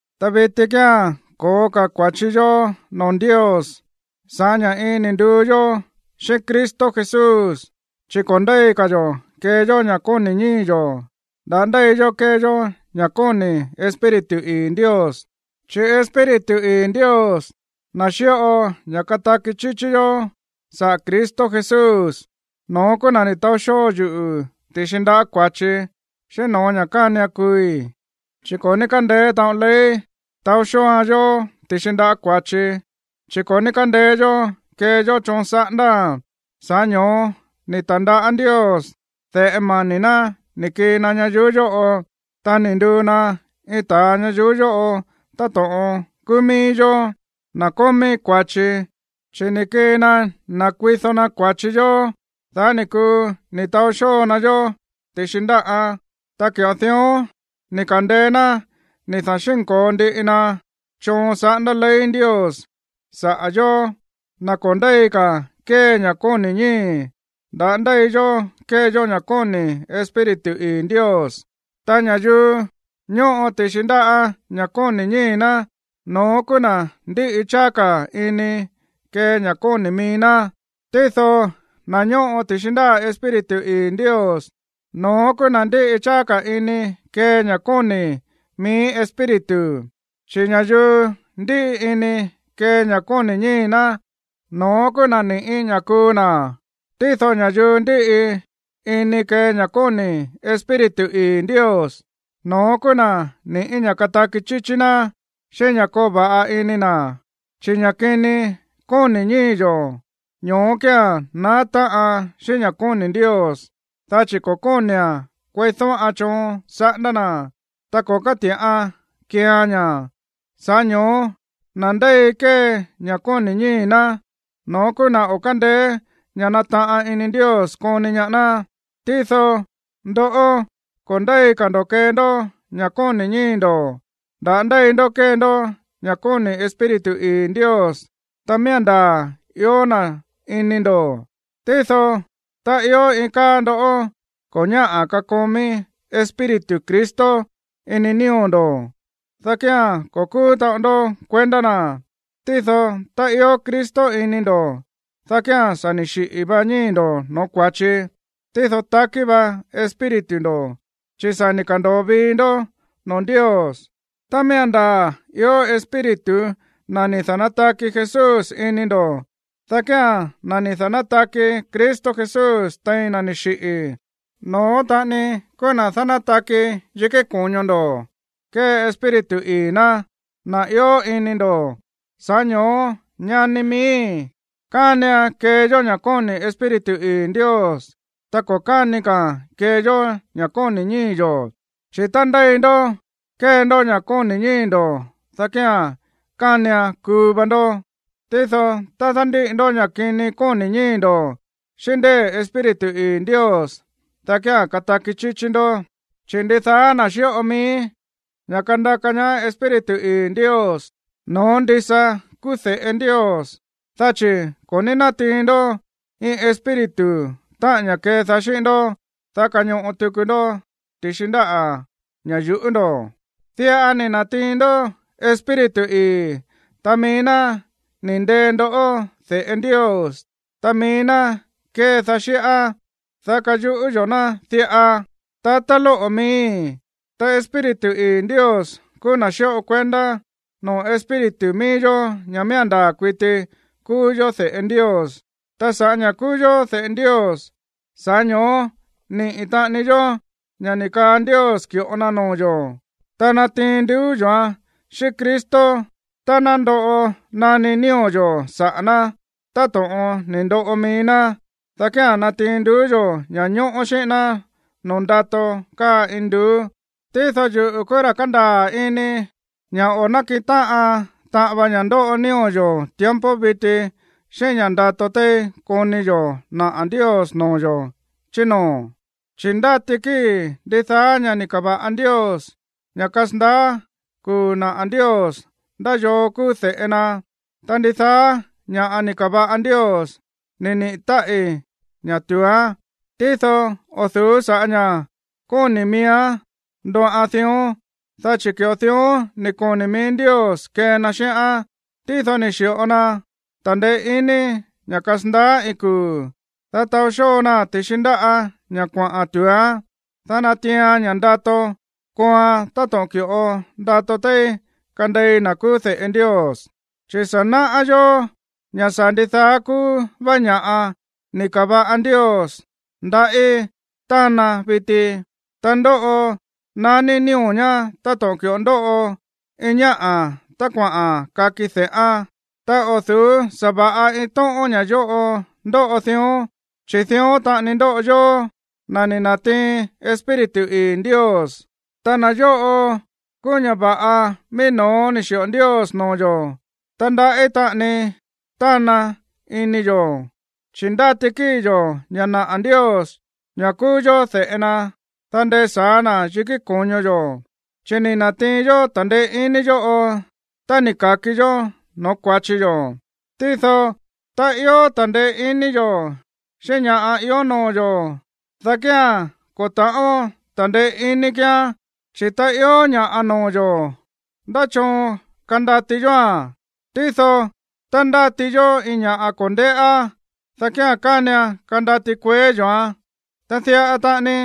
Ta viti kía̱n ko̱ó ka̱ kua̱chi yó noo̱ Ndios sa̱ꞌá ña̱ iin ni̱ nduu yó xíꞌín Cristo Jesús, chi̱ ko̱ ndéi ka̱ yo̱ kee yó ña̱ kóni̱ ñíi̱ yo̱, nda̱á ndéi yó kée yó ña̱ kóni̱ Espíritu ii̱ Ndios. Chi̱ Espíritu ii̱ Ndios, na̱ xíꞌo ña̱ kataki chíchí yó saꞌa̱ Cristo Jesús, no̱ón kúú na̱ ni̱ taó xóo yuꞌu̱ ti̱xi ndaꞌá kua̱chi, xíꞌín no̱ó ña̱ kánian kuui̱. Chi̱ ko̱ ní kándeé taꞌon ley taó xóoan yó ti̱xi ndaꞌá kua̱chi, chi̱ ko̱ ní kándeé yó kee yó choon saꞌándáa̱n. Sa̱ꞌá ño̱ó ni̱ ta̱ndaꞌá Ndios de̱ꞌe mani̱ ná ni̱ kii na ñayuú yóꞌo, ta ni̱ nduu na iin ta̱a ñayuú yóꞌo táto̱ꞌon kúú mií yó, na̱ kómí kua̱chi. Chi̱ ni̱ kii na nakuido na kua̱chi yó, dá ni̱ kuu ni̱ taó xóo na yó ti̱xi ndáꞌán. Ta ki̱ꞌo dión ni̱ ka̱ndeé ná ni̱ da̱xínko̱o ndiꞌi na choon saꞌándá ley Ndios saꞌa̱ yóó, na̱ ko̱ ndéi ka̱ kee ña̱ kóni̱ ñíi̱, nda̱á ndéi yó kée yó ña̱ kóni̱ Espíritu ii̱ Ndios. Ta ña̱yuu ñóꞌo ti̱xi ndaꞌá ña̱ kóni̱ ñíi̱ ná, no̱ón kúú na̱ ndíꞌi cháá ka̱ ini kee ña̱ kóni̱ mií ná. Tído na̱ ñóꞌo ti̱xi ndáꞌa̱ Espíritu ii̱ Ndios, no̱ón kúú na̱ ndíꞌi cháá ka̱ ini kee ña̱ kóni̱ mií Espíritu. Chi̱ ña̱yuu ndíꞌi ini kee ña̱ kóni̱ ñíi̱ ná, no̱ón kúú na̱ ni̱ꞌí ña̱ kuu na̱. Tído ña̱yuu ndíꞌi ini kee ña̱ kóni̱ Espíritu ii̱ Ndios, no̱ón kúú na̱ ni̱ꞌí ña̱ kataki chíchí ná, xíꞌín ña̱ koo va̱ꞌa ini na̱. Chi̱ ña̱ kini kóni̱ ñíi̱ yo̱, ño̱ó kía̱n naá táꞌan xíꞌín ña̱ kóni̱ Ndios, dá chi̱ ko̱ kóni̱a̱n kueídóꞌan choon saꞌándá na̱, ta ko̱ káti̱ꞌaan keean ña̱. Sa̱ꞌá ño̱ó na̱ ndéi kée ña̱ kóni̱ ñíi̱ ná, no̱ón kúú na̱ o̱ kándeé ña̱ nataꞌan ini Ndios koni ñaá ná. Tído ndoꞌó, ko̱ ndéi ka̱ ndo̱ kee ndó ña̱ kóni̱ ñíi̱ ndo̱, nda̱á ndéi ndó kée ndó ña̱ kóni̱ Espíritu ii̱ Ndios, tá miía̱n ndaa̱ ió na̱ ini ndo̱. Tído tá ió iin káa ndó ko̱ ñáꞌa̱ kakomí Espíritu Cristo ini nío̱ ndo̱, dá kía̱n ko̱ kúú taꞌon ndó kuendá na̱. Tído tá ió Cristo ini ndo̱, dá kía̱n sa̱ ni̱ xiꞌi̱ va ñíi̱ ndo̱ no̱ó kua̱chi, tído takí va espíritu ndo̱, chi̱ sa̱ ni̱ ka̱ndo̱o vii ndó noo̱ Ndios. Tá miía̱n ndaa̱ ió Espíritu na̱ ni̱ da̱nátaki Jesús ini ndo̱, dá kía̱n na̱ ni̱ da̱nátaki Cristo Jesús tein na̱ ni̱ xiꞌi̱, no̱ón taꞌani kúú na̱ dánátaki yikí ko̱ño ndo̱ kée Espíritu ii̱ ná, na̱ ió ini ndo̱. Sa̱ꞌá ño̱ó, ñani miíi̱, kánian kee yó ña̱ kóni̱ Espíritu ii̱ Ndios, ta ko̱ káni ka̱a̱n kee yó ña̱ kóni̱ ñíi̱ yo̱. Chi̱ tá ndéi ndó kée ndó ña̱ kóni̱ ñíi̱ ndo̱, dá kía̱n kánian kuu va ndó. Tído tá dándíꞌi ndó ña̱ kini kóni̱ ñíi̱ ndo̱ xíꞌín ndée̱ Espíritu ii̱ Ndios, dá kía̱n kataki chíchí ndó. Chi̱ ndidaá na̱ xíꞌo mií ña̱ kandaka ñaá Espíritu ii̱ Ndios, no̱ón ndisa kúú de̱ꞌe Ndios. Dá chi̱ ko̱ ní nátiin ndó iin espíritu, táꞌa̱n ña̱ kedaá xíꞌín ndó, dá kañoꞌo tuku ndó ti̱xi ndáꞌa̱ ña̱ yu̱ꞌú ndo̱. Diꞌa ni̱ na̱tiin ndó Espíritu ii̱. Ta mií ná ni̱ ndee ndó de̱ꞌe Ndios. Ta mií ná kédaá xíꞌá, dá káyuꞌú yó na̱ diꞌa: “Tatá lóꞌo̱ miíi̱.” Ta Espíritu ii̱ Ndios kúú na̱ xíꞌo kuendá noo̱ espíritu míí yó ña̱ miía̱n ndaa̱ kuiti kúú yó de̱ꞌe Ndios. Ta sa̱ꞌá ña̱ kúú yó de̱ꞌe Ndios, sa̱ꞌá ño̱ó niꞌi̱ taꞌani yó ña̱ ni̱ kaa Ndios ki̱ꞌo na noo̱ yo̱, ta natiin nduú yo̱án xíꞌín Cristo. Tá ná ndoꞌo naní nío̱ yo̱ saꞌa̱ ná, táto̱ꞌon ni̱ ndoꞌo mií ná, dá kía̱n natiin nduú yo̱ ña̱ñóꞌó xíꞌín ná noo̱ ndato káa induú. Tído yuꞌu̱ kúú ra̱ kándaa̱ ini ña̱ o̱ nákiꞌin táꞌan taꞌan vaan ña̱ ndóꞌo nío̱ yo̱ tiempo viti xíꞌín ña̱ ndato téí koni yo̱ naꞌa̱ Ndios noo̱ yo̱ chí noo̱. Chi̱ ndáti kíi̱ ndidaá ña̱ꞌa ni̱ ka̱va̱ꞌa Ndios ña̱ kasandaá kuu̱ naꞌa̱ Ndios ndá yoo kúú de̱ꞌe na. Ta ndidaá ña̱ꞌa ni̱ ka̱va̱ꞌa Ndios ni̱ niꞌi̱ táꞌi̱ ña̱ tu̱úán. Tído o̱ du̱ú sa̱ꞌá ña̱ kóni̱ miíán ndóꞌan dión, dá chi̱ ki̱ꞌo dión ni̱ koni̱ mií Ndios kee na xíꞌán. Tído ni̱ xi̱ꞌo na ta̱ndeé iní ña̱ kasandaá iin kuu̱, dá taó xóo naa̱n ti̱xi ndáꞌa̱ ña̱ kuaꞌa̱n tu̱úán, dá natiian ña̱ ndato kooan táto̱ꞌon ki̱ꞌo ndato téí kandei na̱ kúú de̱ꞌe Ndios. Chi̱ sa̱ náꞌá yó ña̱ sa̱ ndidaá kúú vá ña̱ꞌa ni̱ ka̱va̱ꞌa Ndios ndaꞌí tána viti, ta ndóꞌo naní nío̱ ñá táto̱ꞌon ki̱ꞌo ndóꞌo iin ñáꞌa̱ tá kuaꞌa̱n kaki de̱ꞌán. Ta o̱ du̱ú sa̱va̱ꞌa iin tóꞌón ña̱ yóꞌo ndóꞌo dión. Chi̱ dión taꞌani ndóꞌo yóó, na̱ ni̱ na̱tiin Espíritu ii̱ Ndios, ta na̱ yóꞌo kúú ña̱ va̱ꞌa mií no̱ó ni̱ xi̱ꞌo Ndios noo̱ yo̱. Ta ndaꞌí taꞌani tána ini yo̱, chi̱ ndáti kíi̱ yo̱ ña̱ naꞌa̱ Ndios ña̱ kúú yó de̱ꞌe na, dá ndesa̱á na̱ yikí ko̱ño yo̱. Chi̱ ni̱ na̱tiin yó ta̱ndeé iní yóꞌo tá ni̱ ka̱ki yó no̱ó kua̱chi yo̱. Tído tá ió ta̱ndeé iní yo̱ xíꞌín ña̱ꞌa ió noo̱ yo̱, dá kía̱n ko̱ ta̱ꞌón ta̱ndeé iní kíán. Chi̱ tá ió ña̱ꞌa noo̱ yo̱, ¿ndá choon kandati yóa̱n? Tído tá ndáti yó iin ña̱ꞌa ko̱ ndéꞌá, dá kía̱n kánian kandati kueé yo̱án. Ta diꞌa taꞌani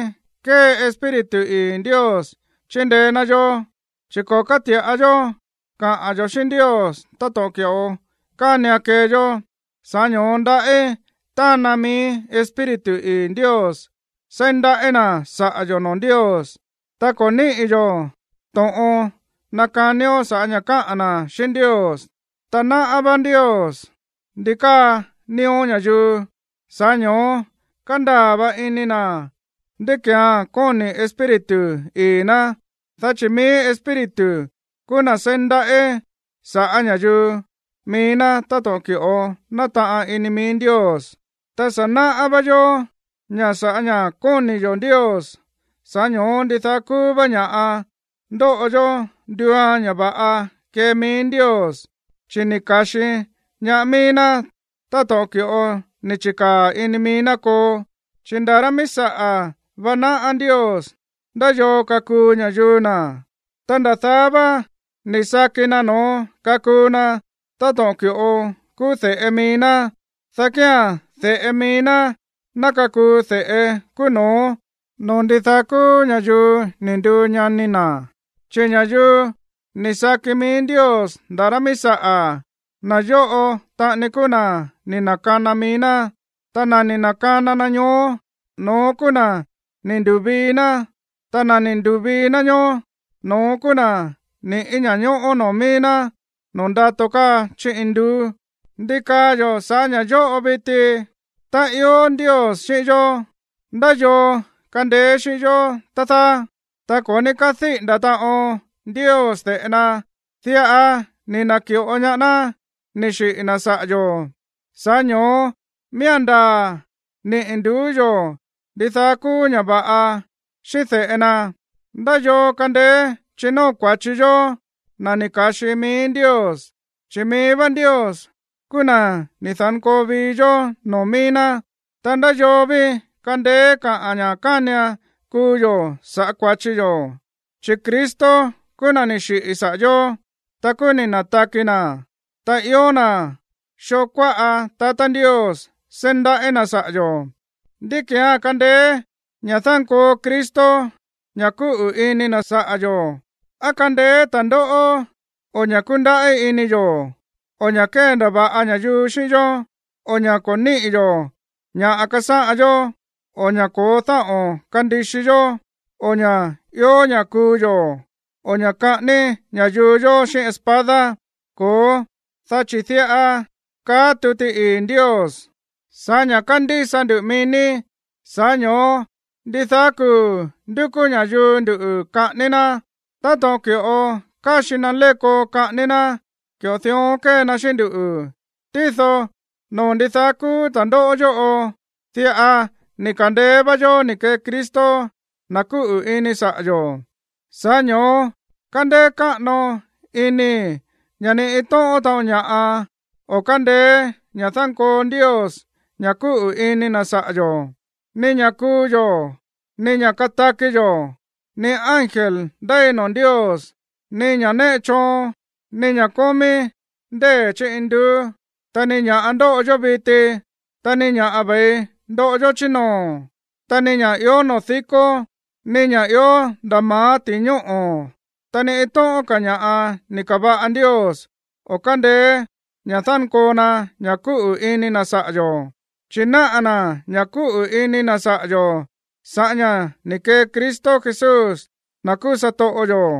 kée Espíritu ii̱ Ndios chíndeé ná yó, chi̱ ko̱ káti̱ꞌa yó kaꞌa̱n yo̱ xíꞌín Ndios táto̱ꞌon ki̱ꞌo kánian kee yó. Sa̱ꞌá ño̱ó ndaꞌí tána mií Espíritu ii̱ Ndios seí ndaꞌí na̱ saꞌa̱ yo̱ noo̱ Ndios. Ta ko̱ níꞌi̱ yó to̱ꞌon nakanió sa̱ꞌá ña̱ káꞌa̱n na̱ xíꞌín Ndios. Ta náꞌá vá Ndios ndi káa nío̱ ña̱yuu. Sa̱ꞌá ño̱ó kándaa̱ va̱ꞌa ini na̱ ndí ki̱án kóni̱ Espíritu ii̱ ná, dá chi̱ mií Espíritu kúú na̱ seí ndaꞌí sa̱ꞌá ña̱yuu mií ná táto̱ꞌon ki̱ꞌo nátaꞌan ini mií Ndios. Ta sa̱ náꞌá vá yó ña̱ sa̱ꞌá ña̱ kóni̱ yo̱ Ndios, sa̱ꞌá ño̱ó ndidaá kúú vá ña̱ꞌa ndóꞌo yó ndúuan ña̱ va̱ꞌa kée mií Ndios, chi̱ ni̱ ka̱xi ñaá mií ná táto̱ꞌon ki̱ꞌo ni̱ chi̱kaa̱ ini mií ná koo. Chi̱ nda̱ rá míí saꞌa̱ vá náꞌá Ndios ndá yoo kakuu ña̱yuu na̱, ta nda̱ daá vá ni̱ saki na̱ no̱ón kakuu na táto̱ꞌon ki̱ꞌo kúú de̱ꞌe mií ná, dá kía̱n de̱ꞌe mií ná ná kakuu de̱ꞌe kúú no̱ó noo̱ ndidaá kúú ña̱yuu ni̱ nduu ñani na̱. Chi̱ ña̱yuu ni̱ saki mií Ndios nda̱ rá míí saꞌa̱, na̱ yóꞌo taꞌani kúú na̱ ni̱ na̱kana mií ná. Ta na̱ ni̱ na̱kana na ñoó, no̱ón kúú na̱ ni̱ ndu̱vii ná. Ta na̱ ni̱ ndu̱vii ná ñoó, no̱ón kúú na̱ ni̱ꞌí ña̱ñóꞌó noo̱ mií ná noo̱ ndato káa chí induú. ¿Ndi kaa yo̱ saꞌa̱ ña̱ yóꞌo, viti? Tá ió Ndios xíꞌín yó, ¿ndá yoo kandeé xíꞌín yó, tá dáá? Ta ko̱ ní kádíꞌi̱nda̱ taꞌon Ndios de̱ꞌe na, diꞌa ni̱ na̱ki̱ꞌo ñaá ná ni̱ xiꞌi̱ na̱ saꞌa̱ yo̱. Sa̱ꞌá ño̱ó miía̱n ndaa̱ niꞌi̱ nduú yo̱ ndidaá kúú ña̱ va̱ꞌa xíꞌín de̱ꞌe na. ¿Ndá yoo kandeé chinóo kua̱chi yóó, na̱ ni̱ ka̱xi mií Ndios? Chi̱ mií vá Ndios kúú na̱ ni̱ da̱nkoo vii yó noo̱ míí ná. Ta, ¿ndá yoo ví kandeé kaꞌa̱n ña̱ kánian kuu yo̱ sa̱ꞌá kua̱chi yo̱? Chi̱ Cristo kúú na̱ ni̱ xiꞌi̱ saꞌa̱ yó, ta kúú ni̱ na̱taki na̱, ta ió na̱ xoo kuáꞌa tatá Ndios seí ndaꞌí na̱ saꞌa̱ yo̱. ¿Ndí ki̱án kandeé ña̱ dánkoo Cristo ña̱ kúꞌu̱ ini na̱ saꞌa̱ yo̱? ¿Á kandeé ta̱ndóꞌó, o ña̱ kúndaꞌí ini yo̱, o ña̱ kéndava̱ꞌa ña̱yuu xíꞌín yó, o ña̱ ko̱ níꞌi̱ yo̱ ña̱ꞌa kasáꞌan yó, o ña̱ ko̱ó dáꞌo̱n kandixi yó, o ña̱ i̱o ña̱ kuu yo̱, o ña̱ kaꞌání ña̱yuu yó xíꞌín espada? Ko̱ó, dá chi̱ diꞌa káꞌa̱n tuti ii̱ Ndios: Sa̱ꞌá ña̱ kándísa nduꞌu̱ mií ní, sa̱ꞌá ño̱ó ndidaá kuu̱ ndúkú ña̱yuu nduꞌu̱ kaꞌání ná. Táto̱ꞌon ki̱ꞌo káxi na léko kaꞌání ná, ki̱ꞌo dión kée na xíꞌín nduꞌu̱. Tído noo̱ ndidaá kúú ta̱ndóꞌó yóꞌo, diꞌa ni̱ ka̱ndeé vá yó ni̱ kee Cristo, na̱ kúꞌu̱ ini saꞌa̱ yo̱. Sa̱ꞌá ño̱ó kándéé káꞌano inii̱ ña̱ ni iin tóꞌón taꞌon ña̱ꞌa o̱ kándeé ña̱ dánkoo Ndios ña̱ kúꞌu̱ ini na̱ saꞌa̱ yo̱. Ni ña̱ kuu yo̱, ni ña̱ kataki yo̱, ni ángel ndéi noo̱ Ndios, ni ña̱ néꞌe choon, ni ña̱ kómí ndée̱ chí induú, ta ni ña̱ꞌa ndóꞌo yó viti, ta ni ña̱ꞌa ve̱i ndoꞌo yó chí noo̱, ta ni ña̱ ió noo̱ díkó, ni ña̱ ió nda̱ ma̱á ti̱i ñóꞌo̱, ta ni iin tóꞌón ka̱ ña̱ꞌa ni̱ ka̱va̱ꞌa Ndios o̱ kándeé ña̱ dánkoo na ña̱ kúꞌu̱ ini na̱ saꞌa̱ yo̱, chi̱ náꞌa̱ na̱ ña̱ kúꞌu̱ ini na̱ saꞌa̱ yo̱ sa̱ꞌá ña̱ ni̱ kee Cristo Jesús, na̱ kúú satoꞌo yo̱.